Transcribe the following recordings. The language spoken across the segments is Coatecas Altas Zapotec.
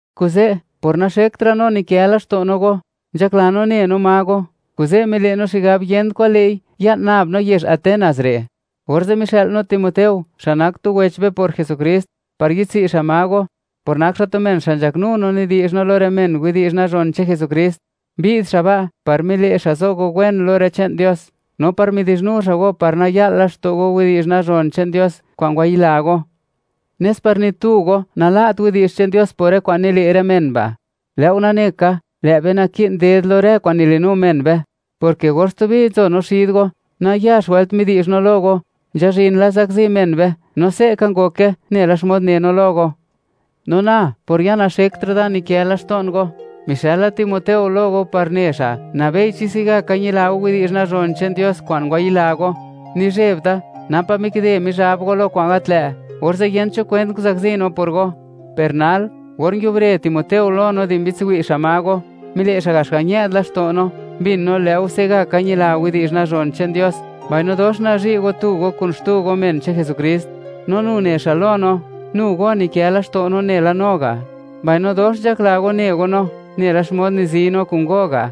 Kuze', por naxektra' no nikë laxto' no go, nzhakla no ne no ma go, kuze' mile' no xigab yent kwa'n lë'i ya'n nab no yezh Atenas re'. Orze' mixë'l no Timoteo, xa' nak tu wech be por Jesukrist, par yi'dtsi' xa' ma go, por nak xa' tu men xa' nzhaknu no nidi'zh no lo rë men widi'zh nazhon che'n Jesukrist. Mbi'd xa' ba' par mile' xa' zo go wen lo rë che'n Dios, no par midi'zhnu xa' go par naya'lt laxto' go widi'zh nazhon che'n Dios kwa'n ngwayila go, nes par ni tu go nala't widi'zh che'n Dios por rë kwa'n nile' rë men ba'; lë' go nane ka, lë' be naki'n ded lo rë kwa'n nilinu men be, porke or stubi nzo no xid go, nayax wëlt midi'zh no lo go, nzhazhin la zakzi men be, no se' ka ngoke nela xmod ne no lo go. No na, por ya naxektra' da nikë laxto'n go, mixëla Timoteo lo go par ne xa', nabei chi se'gaka ñila go widi'zh nazhon che'n Dios kwa'n ngwayila go. Nizheb da, napa' mikide Mizhab go lo kwa'n gat lë', orze' yent cho kwent nguzakzi no por go. Per nal, or nguiubre Timoteo lo no di mbi'dtsi' xa' ma go, mile' xa' gax ga' ñë'd laxto' no, mbin no lë' go se'gaka ñila widi'zh nazhon che'n Dios, mbaino dox nazhi' go guchin go, men che'n Jesukrist. No nu ne xa' lo no, nu go nikë laxto' no nela no ga', mbaino dox nzhakla go, ne go no, nela xmod nizi no kun go ga'.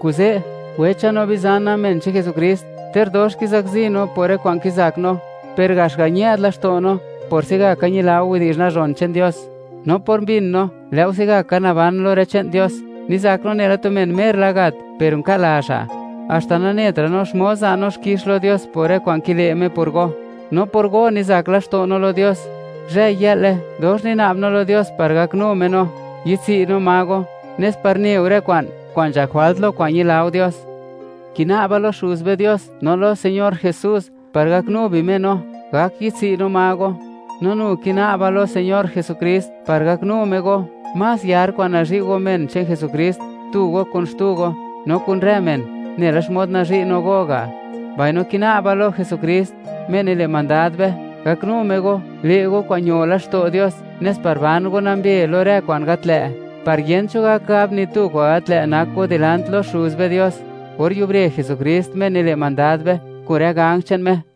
Kuze', wecha no bizana, men che'n Jesukrist, ter dox kizakzi no por rë kwa'n kizak no, per gax ga' ñë'd laxto' no por se'gaka ñila go widi'zh nazhon che'n Dios. No por mbin no, lë' go se'gaka naban lo rë che'n Dios, nizak no nela tu men mer la gat per unka' la xa', haxta nanetra' no xmod za' no xkix lo Dios por rë kwa'n kile' Me por go, no por go nizak laxto' no lo Dios. Zhë-yë'le, dox nina'b no lo Dios par gaknu Me no, yi'dtsi' no ma go, nes par ne go rë kwa'n, kwa'n nzhak jwalt lo kwa'n ñila go Dios. Kina'ba lo Xuz be Dios, no lo Señor Jesús, par gaknu bi Me no, gak yi'dtsi' no ma go. No nu kina'ba lo Señor Jesukrist par gaknu Me go, más yar kwa'n nazhi' go men che'n Jesukrist, tu go kun xtu go, no kun rë men, nela xmod nazhi' no go ga'. Mbaino kina'ba lo Jesukrist, Me nile' mandad be, gaknu Me go, le' go kwa'n ño laxto' Dios, nes par ban go nambe lo rë kwa'n gat lë', par yent cho gak gab ni tu kwa'n gat lë' nak go dilant lo Xuz be Dios, or yubre Jesukrist, Me nile' mandad be, kun rë ganj che'n Me.